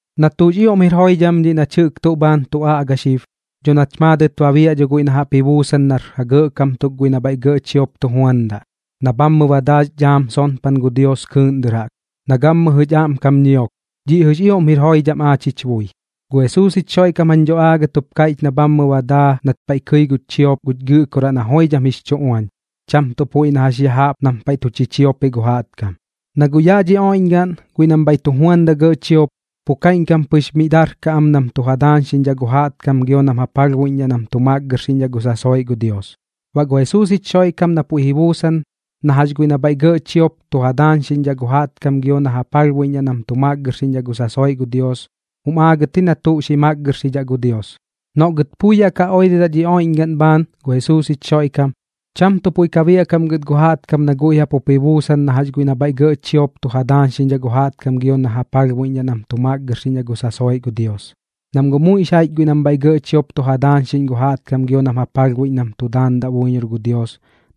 Na tuꞌx ioꞌm jir joidham dhiꞌ nach jɨꞌk tuꞌ bhaan tu aꞌga xib, dho nach maadɨt ba biaꞌ guiꞌ na jaꞌp ji buusan nar ja gɇꞌkam tuk guiꞌ nam bhaiꞌ gɇꞌ chiop tu juandaꞌ, na bhaamɨ ba daa jix dhaam sonpan gu Dios kɨɨꞌn dɨr jaꞌk, na gammɨjɨ jich aꞌmkam ñiok, dhiꞌ jɨꞌx ioꞌm jir joidham aach jich bui. Gu Jesuus jich Xoiꞌkam jañ dho aagɨt jup kaiꞌch na bhammɨ ba daa nat paiꞌ kɨi gu chiop guch Gɨꞌkoraꞌ na joidham jix chu uañ, cham tuꞌ puiꞌ na jax ya jaꞌp nam paiꞌ tu chichiopiꞌ gu jaꞌtkam. Na guꞌ yaꞌ dhi oiꞌñgaꞌn guiꞌ nam bhaiꞌ tu juandaꞌ gɇꞌ chiop, pu kaiꞌñkam pɨx mi darkaꞌ am nam tu ja daañxiꞌñdhaꞌ gu jaꞌtkam gio baꞌ nam ja palhbuiꞌñdhaꞌ nam tu makgɨrxiꞌñdhaꞌ gu sasoiꞌ gu Dios. Baꞌ gu Jesuus jich Xoiꞌkam na puiꞌ ji buusan na jax guiꞌ nam bhaiꞌ gɇꞌ chiop tu ja daañxiꞌñdhaꞌ gu jaꞌtkam gio na ja palhbuiꞌñdhaꞌ nam tu makgɨrxiꞌñdhaꞌ gu sasoiꞌ gu Dios, jum aagɨt ji na tuꞌ xi makgɨrxidhaꞌ gu Dios. Noꞌ gɨt pui yaꞌ oirɨdaꞌ dhi oiꞌñgaꞌn bhaan gu Jesuus jich Xoiꞌkam, cham tuꞌ puiꞌ biaꞌkaꞌm gɨt gu jaꞌtkam noꞌ guiꞌ jaꞌp jup ji buusan na jax guiꞌ nam bhaiꞌ gɇꞌ chiop tu ja daañxiꞌñ gu jaꞌtkam gio na ja palhbuiꞌñ nam tu makgɨrxiꞌñdhaꞌ gu sasoiꞌ gu Dios. Nam guꞌ muiꞌx jaiꞌch guiꞌ nam bhaiꞌ gɇꞌ chiop tu ja daañxiꞌñ gu jaꞌtkam gio nam ja palhbuiꞌñ nam tu daandaꞌ buiñor gu Dios,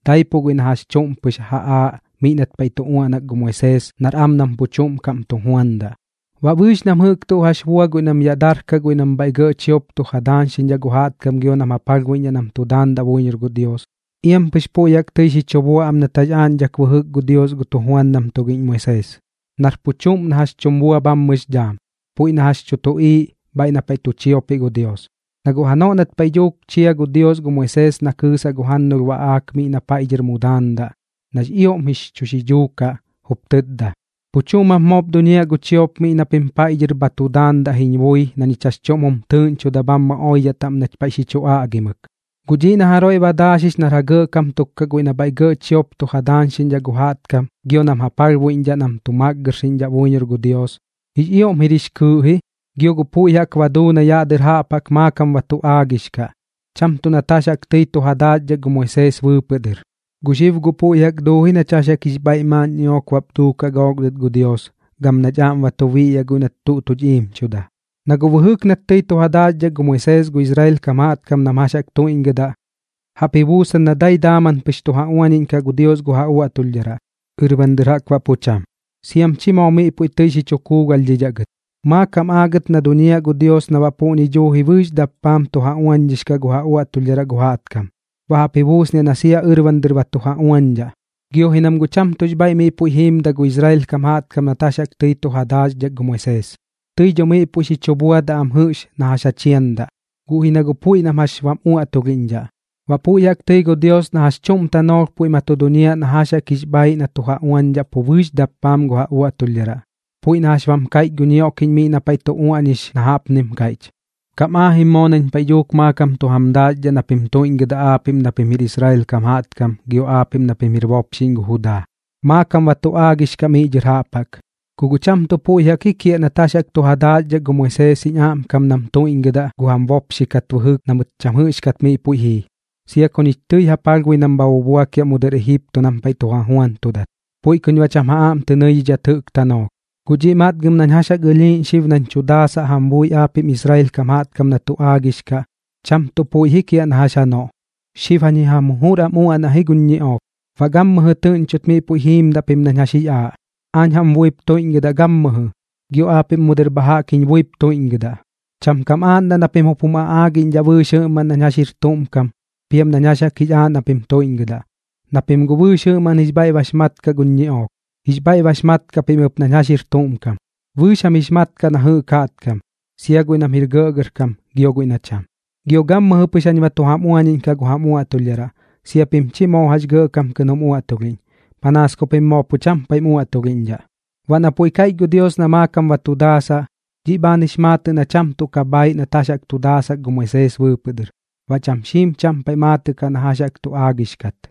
daipuꞌ guiꞌ na jax chuꞌm pɨx ja aaꞌ miꞌ nat paiꞌ tu uaꞌnak gu Moisees nar am nam pu chuꞌm kaꞌm tu juandaꞌ. Baꞌ bɨɨx nam jɨꞌk tuꞌ jax bua guiꞌ nam yaꞌ darkaꞌ guiꞌ nam bhaiꞌ gɇꞌ chiop tu ja daañxiꞌñdhaꞌ gu jaꞌtkam gio nam ja palhbuiꞌñdhaꞌ nam tu daandaꞌ buiñor gu Dios, iam pɨx puiꞌ jaꞌk tɨi xi chu bua am nat jax aaꞌñdhak bɨjɨk gu Dios gu tujuandam tugiꞌñ Moisees, nar pu chuꞌm na jax tum bua bhammɨx dhaam, puiꞌ na jax tu tuꞌiiꞌ bhaiꞌ na paiꞌ tu chiopiꞌ gu Dios. Na guꞌ janoꞌ nat paiꞌ dhuuk chia gu Dios gu Moisees na kɨɨsaꞌ gu jannulh baꞌaak miꞌ na paiꞌ dhɨr mu daandaꞌ, nax ioꞌm jix chu xidhuu kaꞌ, jup tɨtda: “Pu chuꞌm jap moop duñiaꞌ gu chiop miꞌ na pim paiꞌ dhɨr bha tu daandaꞌ jiñ bui na ñich jax chuꞌm jum tɨɨꞌñchoda bhammɨ oidhaꞌ taꞌm nach paiꞌ xi chu aꞌgimɨk.” Guꞌ dhiꞌ na jaroiꞌ ba daaxix xib nar ja gɇꞌkam tuk kaꞌ guiꞌ nam bhaiꞌ gɇꞌ chiop tu ja daañxiꞌñdhaꞌ gu jaꞌtkam gio nam ja palhbuiꞌñdhaꞌ nam tu makgɨrxiꞌñdhaꞌ buiñor gu Dios, jix ioꞌm jir jix kɨɨꞌ ji, gio guꞌ puiꞌ jaꞌk ba duu na yaꞌ dɨr jaꞌp jaꞌk maakam ba tu aagix kaꞌ, cham tuꞌ nat jax jaꞌk tɨi tu ja daaxdhak gu Moisees bɨɨpɨꞌ dɨr. Gu xib guꞌ puiꞌ jaꞌk duu ji nach jax jaꞌk jix bhaiꞌ maaꞌn ñiꞌook bap duukaꞌ gook dɨt gu Dios, gam nach aꞌm ba tu biꞌyaꞌ guiꞌ nat tuꞌ tuch iimchuda. Na guꞌ bɨjɨk nat tɨi tu ja daaxdhak gu Moisees gu Israel kam jaꞌtkam nam jax jaꞌk tuiꞌñgɨdaꞌ, jaꞌp ji buusan na dai daaman pɨx tu ja uañiꞌñkaꞌ gu Dios gu ja uaꞌtulhdharaꞌ, ɨrban dɨr jaꞌk baꞌ pu cham, siam chi moo miꞌ puiꞌ tɨi xi chu kuugalhdhidhaꞌ gɨt. Maakam aagɨt na duñiaꞌ gu Dios na baꞌ puꞌñi duuji bɨɨx dappaam tu ja uañdhix kaꞌ gu ja uaꞌtulhdharaꞌ gu jaꞌtkam, baꞌ jaꞌp ji buusniaꞌ na sia ɨrban dɨr ba tu ja uañdhaꞌ. Gio ji nam guꞌ cham tuꞌx bhaiꞌ miꞌ puiꞌp jiimdaꞌ gu Israel kam jaꞌtkam nat jax jaꞌk tɨi tu ja daaxdhak gu Moisees. Tɨi dho miꞌ puiꞌ xi chu buadaꞌ am jɨꞌx na jax ja chiandaꞌ, guꞌ ji na guꞌ puiꞌ nam jax bam uaꞌtulhiꞌñdhaꞌ. Baꞌ puiꞌ jaꞌk tɨi gu Dios na jax chuꞌm tanoolh puiꞌ ma tu duñiaꞌ na jax jaꞌk jix bhaaiꞌ na tu ja uañdhaꞌ pu bɨɨx dappaam gu ja uaꞌtulhdharaꞌ, puiꞌ na jax bam kaiꞌch gu ñioꞌkiꞌñ miꞌ na paiꞌ tu uaꞌñix na jaꞌpnim kaiꞌch: Kam aajim moo nañ paiꞌ dhuuk maakam tu jam daaxdhaꞌ na pim tuiꞌñgɨdaꞌ aapiꞌm na pim jir Israel kam jaꞌtkam gio aapiꞌm na pim jir bopxiꞌñ gu Judaa, maakam ba tu aagix kaꞌ miꞌ dhɨr jaꞌp jaꞌk. Ku guꞌ cham tuꞌ puiꞌ jaꞌk ji kiaꞌ nat jax jaꞌk tu ja daaxdhak gu Moisees jiñ aꞌmkam nam tuiꞌñgɨdaꞌ gu jam bopxi kat bɨjɨk na mɨt cham jɨꞌxkat miꞌ puiꞌ jii, sia ku ñich tɨi ja palhbui nam bha bubuakiaꞌ mu dɨr Ejipto nam paiꞌ tu ja juantudat. Puiꞌ kuñ baꞌ cham ja aꞌm tɨ nɨidhidhat jɨꞌk tanoolh. Guꞌ dhiꞌ matgam nañ jax jaꞌk ɨlhiiꞌñ xib nañ tu daasaꞌ jam bui aapiꞌm Israel kam jaꞌtkam na tu aagix kaꞌ, cham tuꞌ puiꞌ ji kiaꞌ na jax janoꞌ. Xib jañ ji jam jujur am uaꞌnaꞌ ji guñ ñiꞌook, baꞌ gammɨjɨ tɨꞌñchot miꞌ puiꞌ jiimdaꞌ pim nañ jax jix aaꞌ. Aañ jam buip tuiꞌñgɨdaꞌ gammɨjɨ, gio aapiꞌm mu dɨr bha jaꞌk jiñ buip tuiꞌñgɨdaꞌ. Cham kam aaꞌndaꞌ na pim jum aꞌaagiꞌñdhaꞌ bɨɨx jɨꞌmaꞌn nañ jax jir tuꞌm kam piam nañ jax jaꞌk jix aaꞌ na pim tuiꞌñgɨdaꞌ, na pim guꞌ bɨɨx jɨꞌmaꞌn jix bhaiꞌ bax mat kaꞌ guñ ñiꞌook. Jix bhaiꞌ bax mat kaꞌ pim ɨp nañ jax jir tuꞌm kam, bɨɨx jam jix mat kaꞌ na jɨꞌk jaꞌtkam, sia guiꞌ nam jir gɇꞌgɇrkam gio guiꞌ na cham. Gio gammɨjɨ pɨx jañ ba tu jam uañiꞌñkaꞌ gu jam uaꞌtulhdharaꞌ, sia pim chi moo jax gɇꞌkam kɨꞌn jum uaꞌtulhiꞌñ, panaas ku pim moo pu cham paiꞌm uaꞌtulhiꞌñdhaꞌ. Baꞌ na puiꞌ kaiꞌch gu Dios na maakam ba tu daasaꞌ, dhiꞌ bhaan jix maatɨꞌ na cham tuꞌ ka bhaaiꞌ nat jax chu daasak gu Moisees bɨɨpɨꞌ dɨr, baꞌ cham xiim cham paiꞌ maatɨꞌ kaꞌ na jax jaꞌk tu aagix kat.